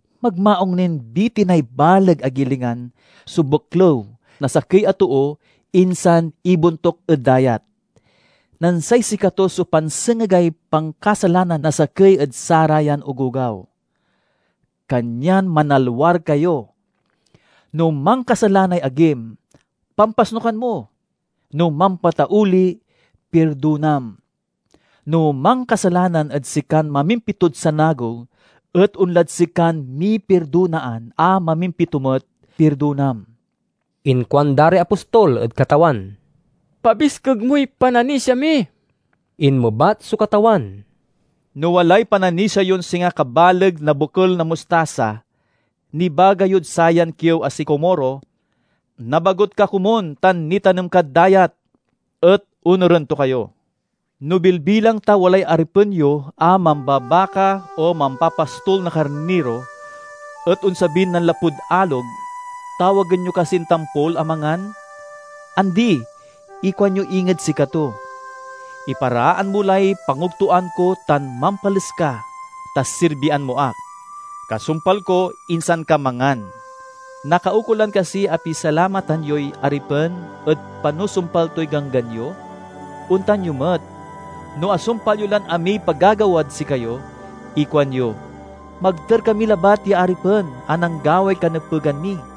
Magmaung nin bitinay baleg a gilingan so beklew na sakey a too insan ibontuk ed dayat, nen say sikato so pansengegay pankasalananan na sakey ed sarayan ogogaw. Kanyan manalwar kayo! "No mankasalanay agim, pampasnukan mo; no mampatauli, pirdonam. No mankasalanan ed sikan mamimpitod sanagew et onlad sikan mipirdonaan a mamimpito met, pirdonam." Inkuanda ray apostol ed Katawan, "Pabiskeg moy pananisia mi." Inmebat so Katawan, "No walay pananisia yon singa kabaleg no bokel na mustasa, nibaga yod sayan kiew a sikomoro, 'Nabagut ka komun tan nitanem kad dayat!' et onuren to kayo." "No bilbilang ta walay aripen yo a mambabaka o mampapastol na karniro, et onsabin nanlapud alog, tawagen yo kasin tampol a mangan? Andi! Ikuanyo inged sikato, 'Iparaan mo lay pangogtoan ko tan mampales ka, ta sirbian mo ak. Kasumpal ko, insan ka mangan!' Nakaukolan kasi a pisalamatan yoy aripen ed panusumpal toy ganggan yo? Ontan yo met. No asumpal yo lan amiy pagagawad sikayo, ikuanyo, 'Magter kami labat ya aripen a nanggaway kanepegan mi!'"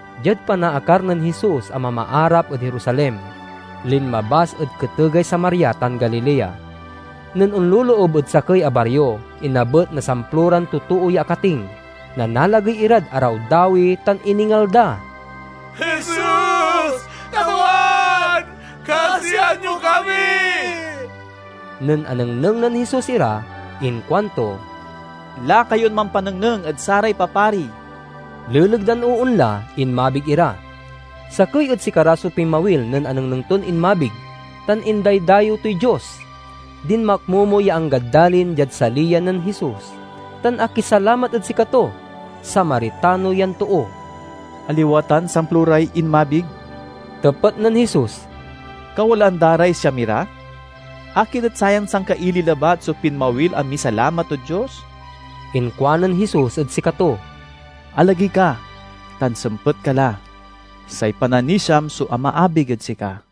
Diad panaakar nen Jesus a mamaarap ed Jerusalem, linmabas ed ketegay Samaria tan Galilea. Nen onloloob ed sakey a bario, inabet na samploran totoo ya akating. Nanalagey irad arawdawi tan iningal da, "Jesus! Katawan! Kasian mo kami!" Nen anengneng nen Jesus ira inkuanto, "Laka yon mampanengneng ed saray papari." Leleg dan oonla, inmabig ira. Sakey ed sikara so pinmawil nen anengneng ton inmabig, tan indaydayew toy Dios. Dinmakmomo ya anggad dalin, diad saliyan nen Jesus, tan akisalamat ed sikato. Samaritano yan too. "Aliwa tan samploray inmabig?" tepet nen Jesus. "Kawalaan da ray siamira? Akin et sayan sangkaili labat so pinmawil a misalamat ed Dios?" Inkuanen Jesus ed sikato, "Alagey ka, tan sempet ka la. Say pananisiam so amaabig ed sika."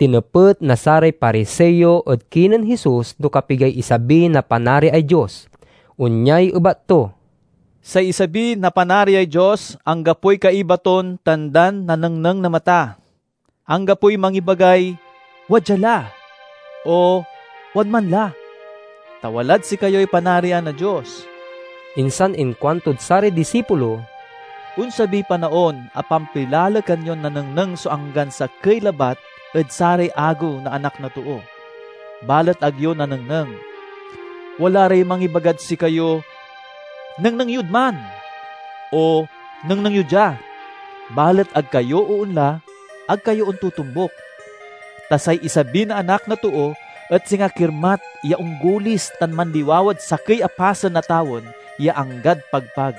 Tinepet na saray Pariseo ed kinen Jesus no kapigay isabi na Panariay Dios. Onyay ebat to, "Say isabi na Panariay Dios anggapoy kaiba ton tandan nanengneng na mata. Anggapoy mangibagay 'Wadya la!' o 'Wadman la!'; ta walad sikayoy Panarian na Dios." Insan inkuantod saray disipulo, "Onsabiy panaon a pampilalekan yon nanengneng so anggan sakey labat ed saray agew na Anak na Too, balet ag yo nanengneng. Wala ray mangibagad sikayo, 'Nengneng yod man!' o 'Nengneng yo dia!' Balet ag kayo oonla, ag kayo ontotombuk. Ta say isabi na Anak na Too et singa kirmat ya onggulis tan manliwawad sakey a pasen na tawen ya anggad pagpag.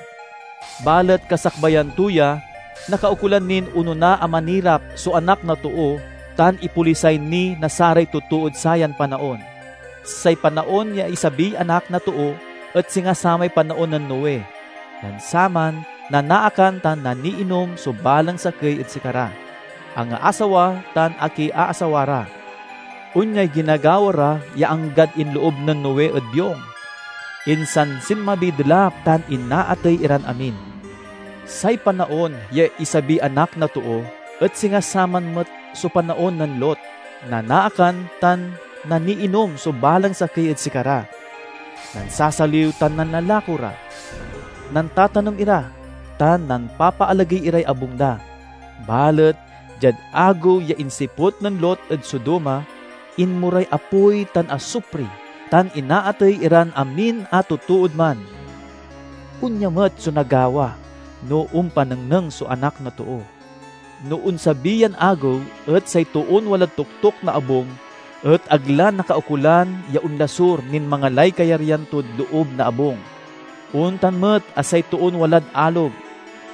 Balet kasakbayan to ya, nakaukolan nin onona a manirap so Anak na Too tan ipolisay ni na saray totood sayan panaon. Say panaon ya isabiy Anak na Too et singa samay panaon nen Noe. Nen saman, nanaakan tan naniinom so balang sakey ed sikara, angaasawa tan akiaasawa ra. Onyay ginagawa ra ya anggad inloob nen Noe ed biong. Insan sinmabiy delap tan inaatey iran amin. Say panaon ya isabiy Anak na Too et singa saman met so panaon nen Lot; nanaakan tan naniinom so balang sakey ed sikara, nansasaliw tan nanlalako ra, nantatanem ira, tan nampapaalagey iray abung da. Balet diad agew ya insiput nen Lot ed Sodoma, inmoray apoy tan asupri tan inaatey iray amin a totood man. Onya met so nagawa no ompanengneng so Anak na Too. "No onsabi yan agew say toon walad toktok na abung ag la nakaukolan ya onlasur nin mangalay kayaryan tod loob na abung. Ontan met a say toon walad alog,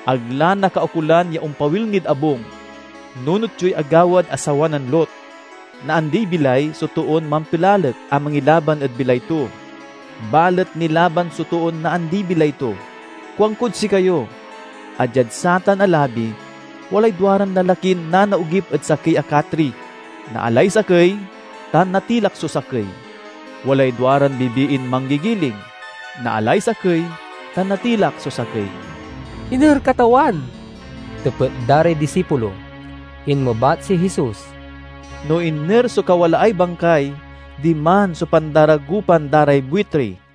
ag la nakaukolan ya ompawil nid abung. Nunot yoy agawad asawa nen Lot! Naandiy bilay so toon mampilalek a mangilaban ed bilay to; balet nilaban so toon naandi bilay to. Kuankod sikayo a diad satan a labi, walay duaran lalakin nanaogip ed sakey a katri: naalay sakey, tan natilak so sakey. Walay duaran bibiin manggigiling: naalay sakey, tan natilak so sakey. "Iner, Katawan?" tepet da ray disipulo. Inmebat si Jesus, "No iner so kawalaay bangkay, diman so pandaragopan da ray buitri."